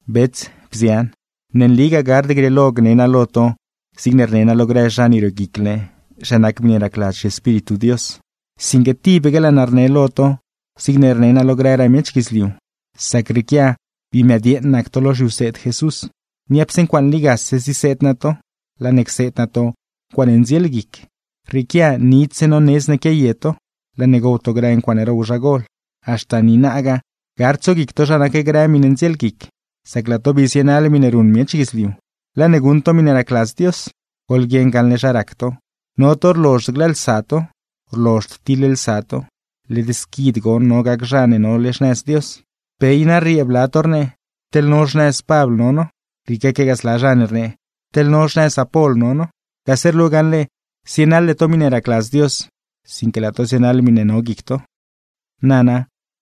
Bets, bzian, ne nligaa gard grieelo gne naa lo to zigne rne naa lo grë zha ne rioguicle zha nac miṉe racladz zhiEspíritu Dios, sinque tibaque laa naa rne lo to zigne rne naa lo grëraa miech guidzliu, sac rrieequia bii mëdyeeṉ nac to lo zhiwseed Jesús. Niapse ncuaaṉe ligase ziseed naa to, laa ne cseed naa to ncuaaṉe ndzielguic. Rrieequia nidzse nonedz naa quiaye to, laa ne gow to grë ncuaaṉe row zha gol. Haxta niinagaa gard tsoguic to zha nac grë miṉe ndzielguic, sacne laa to bii zienaḻ miṉe ruṉ miech guidzliu, laa ne guṉ to miṉe racladz Dios. Goḻguieṉ gaṉle zha rac to, no to rlozhd glëëlsa to, rlozhd tiḻlsa to. ¡Led squid goṉ no gac zha ne nole xnëz Dios! Pe i na rriee bla to rnee: “Teḻ no xnëz Pabl no no”, rrieequegaa zla zha ne rnee: “Teḻ no xnëz Apol no no.” Gase rlu gaṉle zienaḻde to miṉe racladz Dios, sinque laa to zienaḻ miṉe no guic to. Nana,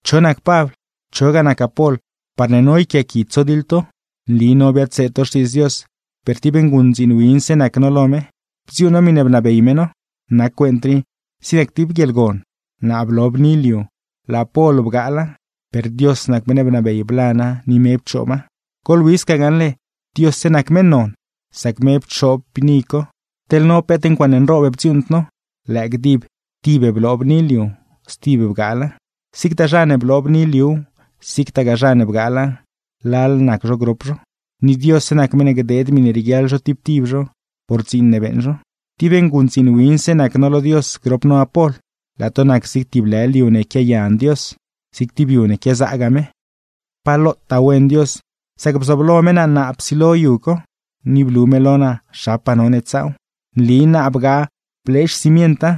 ¿cho nac Pabl, chogaa nac Apol parne no yquiaaqui tsodiḻ to? Nli no biadseed to Xtiidz Dios, per tib nguṉdziin winse nac no lo me, bdziuuṉ no miṉe rnabey me no. Nac cuent rii zig nac tib guieḻgon, naa blo bni liu, laa Apol bgaala; per Dios nac meṉ ne bnabey blana ni me pchooba. Goḻwi sca gaṉle Diosse nac meṉ non, sac me pchoob bni co, teḻ no peet ncuaaṉe nroob bdziuuṉd no, lëë gdib tib bloo bni liu, stib bgaala. Zigtaa zha ne bloo bni liuw, zigtagaa zha ne bgaala, lal nac zho grop zho; ni Diosse nac meṉ ne gdeed miṉe rieguiaḻ zho tib tib zho por dziin ne beeṉ zho. Tib nguṉdziin winse nac no lo Dios grop no Apol; laa to nac zig tib lë liu ne quiayan Dios, zig tib yu ne quiazaagaa me. Pa lotaa wen Dios, sac bzooblo me naa naa psilo yu co, ni blu me lo naa zhapaa none tsaaw. Nli naa bgaa blee xcimienta,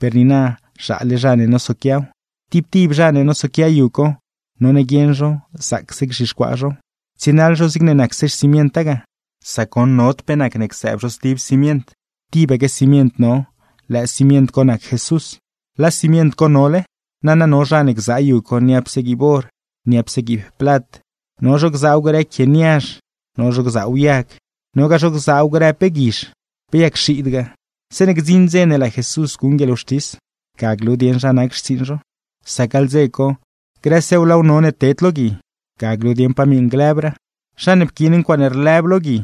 per niina zhaale zha ne nosoquiaw. Tib tib zha ne nosoquia yu co, none guieṉ zho zaacse gzhixcuaa zhow, tsienaḻ zho zigne nacse xcimienta ga, sac goṉ nod pe nacne csëëb zho stib cimient, tibaque cimient no, lëë cimient co nac Jesús. ¡Laa cimient co nole! Nana no zho gzaa yu co niapse guiib or, niapse guiib plat, no zho gzaaw grë quie niazh, no zho gzaaw yag, nogaa zho gzaaw grë pe guizh, pe yag xiidgaa. Zeeṉe gdziṉ dze ne laa Jesús guṉ guieḻwxtis, ga glu dieṉ zha nac xtsiiṉ zho; sac gaḻ dze co grësew laaw none ted lo gui, ga glu dieṉ pa miṉ lëbraa. Zha ne pquiin ncuaaṉe rlëb lo gui,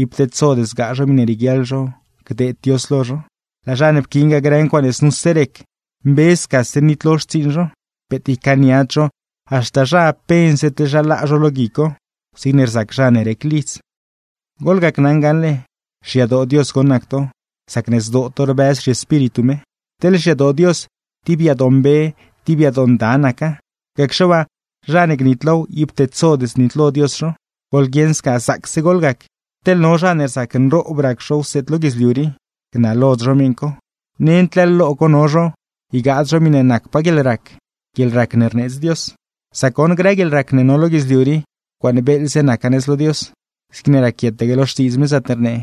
ib tedsod zgaa zho miṉe rieguiaḻ zho gdeed Dios lo zho; laa zha ne pquiingaa grë ncuaaṉe znuse rec, mbe scase nitlo xtsiiṉ zho. Peet ycaaniad zho, haxta zha pense teḻ zha laa zho lo gui co, zigne rzac zha ne rec lidz. Goḻgacnaṉ gaṉle xyadoo Dios goṉ nac to, sacne zdoo to rbëz zhiEspíritu me. Teḻ xyadoo Dios, tib yadoo mbe, tib yadoo nda naca; gacxe waa, zha ne gnitlow ib tedsod znitlo Dios zho. Goḻguieṉ sca zaacse goḻgac, teḻ no zha ne rzac nroob rac zho wseed lo guidzliu rii, gnalod zho miṉ co; nend leḻ lo co no zho, ygaad zho miṉe nacpaa guieḻrac, guieḻrac ne rneedz Dios. Sac goṉ grë guieḻrac ne no lo guidzliu rii, ncuaaṉe beeḻze naca nëz lo Dios. Zigne raquietaque lo Xtiidz me zaatne rnee: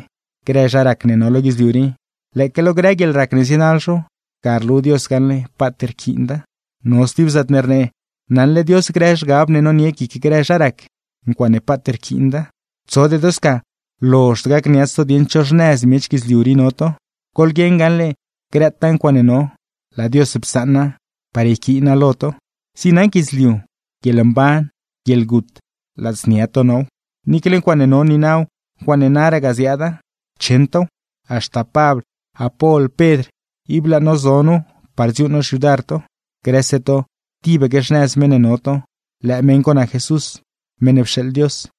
“Grë zha rac ne no lo guidzliu rii, lëëque lo grë guieḻrac ne zienaḻ zho, ga rlu Dios gaṉle paat rquiinda.” No stib zaatne rnee: “Naṉle Dios grë zhgab ne nonie guic grë zha rac, ncuaaṉe paat rquiinda.” Tsode to sca lozhd gacniats to dieṉ cho xnëz miech guidzliu rii no to, goḻguieṉ gaṉle grëtaa ncuaaṉe no, laa Dios psaṉa par yquiina lo to. Zig nac guidzliu, guieḻmban, guieḻgut, ladznia to now, niicle ncuaaṉe no niinaw, ncuaaṉe naragaa ziaada, cheṉ tow; haxta Pabl, Apol, Pedr, ib laa no zo nu par dziuuṉ no xyudar to. Grëse to tibaque xnëz meṉ ne no to, lëë meṉ co nac Jesús, meṉ ne pxeeḻ Dios.